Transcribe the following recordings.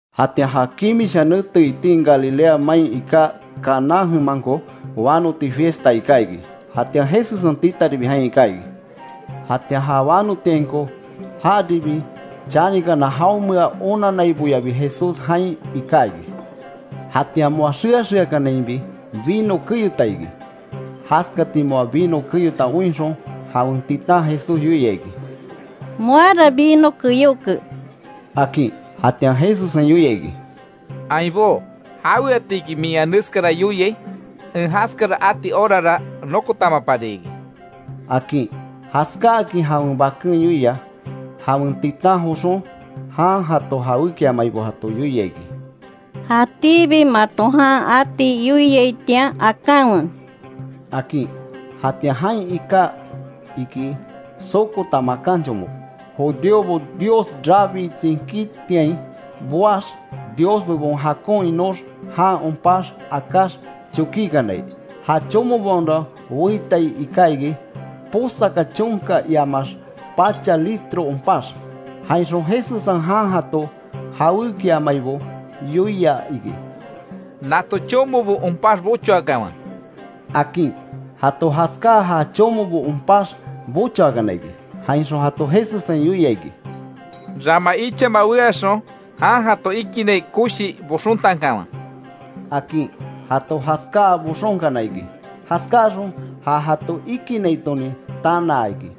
Jatian ja kimisha nete itin Galilea main iká Caná jemanko, wanoti fiesta iká iki, jatian Jesussen titaribi jain iká iki. Jatian ja wanotiainko jaribi chanikana, jaonmea onannaiboyabi Jesús jain iká iki. Jatian moa xea xeakanainbi vino keyota iki. Jaskati moa vino keyota oinxon jawen titan Jesús yoia iki: —Moara vino keyóke —akin. Jatian Jesussen yoia iki: —Ainbó ¿Jaweatiki min ea neskara yoiai? En jaskara ati horara nokotamapari iki —akin. Jaskáakin jawen baken yoia, jawen titan joxon jan jato jawékiamaibo jato yoia iki: —Jatíbi mato jan ati yoiaitian, akanwe —akin. Jatian jain iká iki sokota makan chomo, judíobo Dios rabii tsinkítiain boax Dios bebon jakon inox jan onpax akáx chokikanai. Ja chomobaonra weitai iká iki, posaka chonka, iamaax pacha litro onpax. Jainxon Jesussen jan jato jawékiamaibo yoia iki: —Nato chomobo onpax bochoakanwe —akin. Jato jaskáa, ja chomobo onpax bochoakana iki. Jainxon jato Jesussen yoia iki: —Rama ichama weaxon, jan jato ikinnai koshi boxontankanwe —akin. Jato jaskáa boxonkana iki. Jaskáaxon jan jato ikinnaitonin tanaa iki,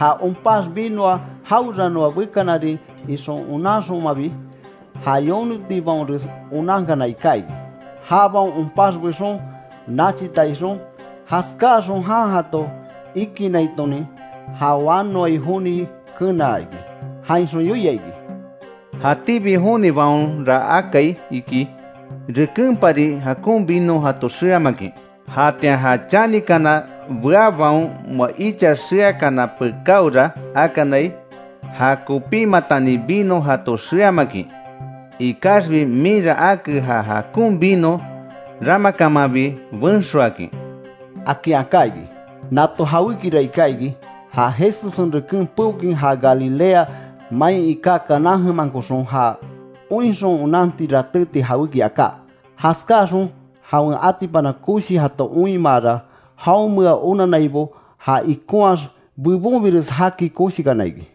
ja onpax vinoa jaweranoa bekanarin ixon onanxonmabi. Ja yonotibaonres onankana iká iki, jabaon onpax bexon nachita ixon. Jaskáaxon jan jato ikinnaitonin ja wanoai joni kenaa iki. Jainxon yoia iki: —Jatíbi jonibaonra akai iki rekenpari jakon vino jato xeamakin, jatian ja chanikana beabaon moa icha xeakana pekáora akanai, ja kopímatani vino jato xeamakin; Ikaxbi minra ake ja jakon vino ramakamanbi benxoakin —akin aká iki. Nato jawékira iká iki ja Jesussen reken peokin, ja Galilea main iká Caná jemankoxon, ja oinxon onanti ratéti jawéki aká. Jaskáaxon jawen atipana koshi jato oinmaara, jaonmea onannaibo ja ikonhaax bebonbires jaki koshikana iki.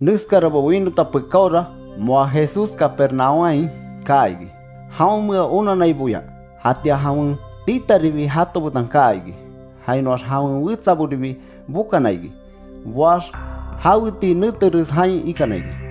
Neskarabo winota pekáora moa Jesús Capernaúmhain kaa iki jaonmea onanaiboya. Jatian jawen titaribi jato betan kaa iki, jainoax jawen wetsaboribi bokana iki, boax jaweti neteres jain ikana iki.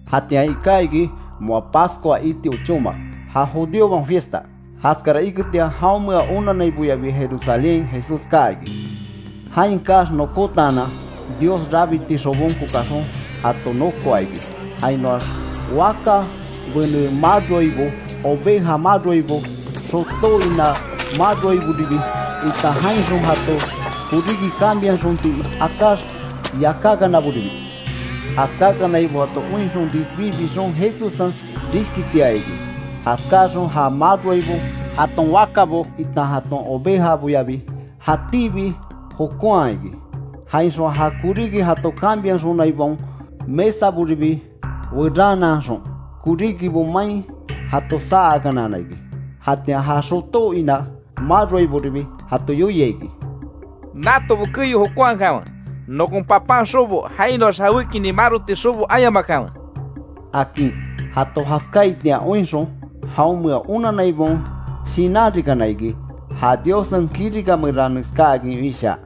Jatian iká iki moa Pascua iti ochóma, ja judíobaon fiesta. Jaskara iketian jaonmea onannaiboyabi Jerusalénhain Jesús kaa iki. Jain kaax nokotaanan, Dios rabiti xobonko kaxon jato nokoa iki, jainoax waka bene maroaibo, oveja maroaibo, xotó inabo maroaiboribi, itan jainxon jato koríki cambiaxonti akax yakákanaboribi. Jaskakanaibo jato oinxon, risbí bixon, Jesussen rishkitiaa iki. Jaskáaxon ja maroaibo, jaton wakabo, itan jaton ovejaboyabi jatíbi jokonha iki. Jainxon ja koríki jato cambiaxonaibaon mesaboribi weranaanxon koríkibo main jato saa akanana iki. Jatian ja xotó ina maroaibobiribi jato yoia iki: —¡Natobo keyo jokonhakanwe! ¡Nokon Papan xobo, jainoax jawékinin maroti xobo ayamakanwe! —akin. Jato jaskáaitian oinxon, jaonmea onannaibaon shinanrikana iki, ja Diossen kirika meran neskáakin wishaa: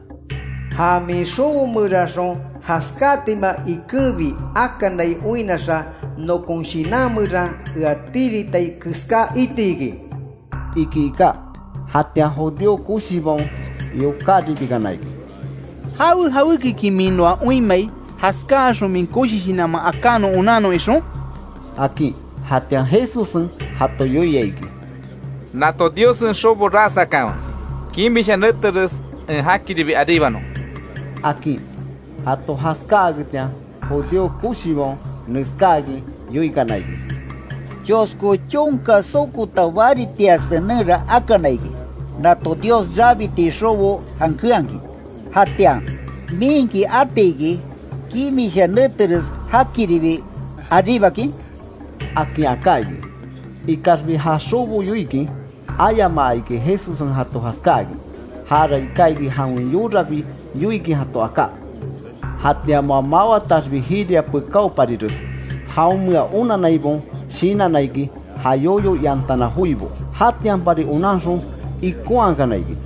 “Ja min xobo meranxon jaskátima ikenbi akanai oinnaxa nokon shinan meran ea tiritai keská iti iki”, iki iká. Jatian judío koshibaon, yokáribikana iki: —¿Jawe jawékiki min noa oinmai, jaskáaxon min koshi shinanman aká non onannon ixon? —akin. Jatian Jesussen jato yoia iki: —Nato Diossen xobo ras akanwe, kimisha neteres en jakiribi aríbanon —akin. Jato jaskáaketian, judío koshibaon neskáakin yoikana iki: —Chosko chonka sokota baritia senenra akana iki, nato Dios rabiti xobo jankenhakin. Jatian ¿Minki atiki, kimisha neteres jakiribi aríbakin? —akin aká iki. Ikaxbi ja xobo yoikin ayamaa iki Jesussen jato jaskákin. Jara iká iki jawen yorabi yoikin jato aká. Jatian moa mawataxbi jiria pekáoparires, jaonmea onannaibaon shinanna iki, ja yoyo iantana joibo. Jatianpari onanxon ikonhakana iki,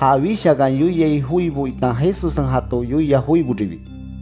ja wishakan yoiai joibo itan Jesussen jato yoia joiboribi.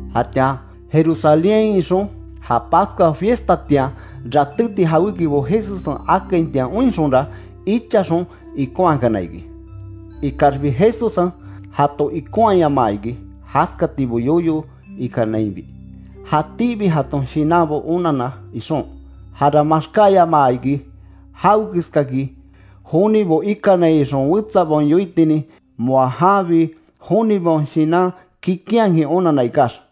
Jatian Jerusalénhain ixon, ja Pascua fiestatian ratéti jawékibo Jesussen akaitian oinxonra, ichaxon ikonhakana iki. Ikaxbi Jesussen jato ikonhayamaa iki jaskatibo yoyo ikanainbi, jatíbi jaton shinanbo onanna ixon. Jara maxkáyamaa iki jawekeskaki jonibo ikanai ixon wetsabaon yoitinin, moa janbi jonibaon shinan kikinhakin onanna ikax.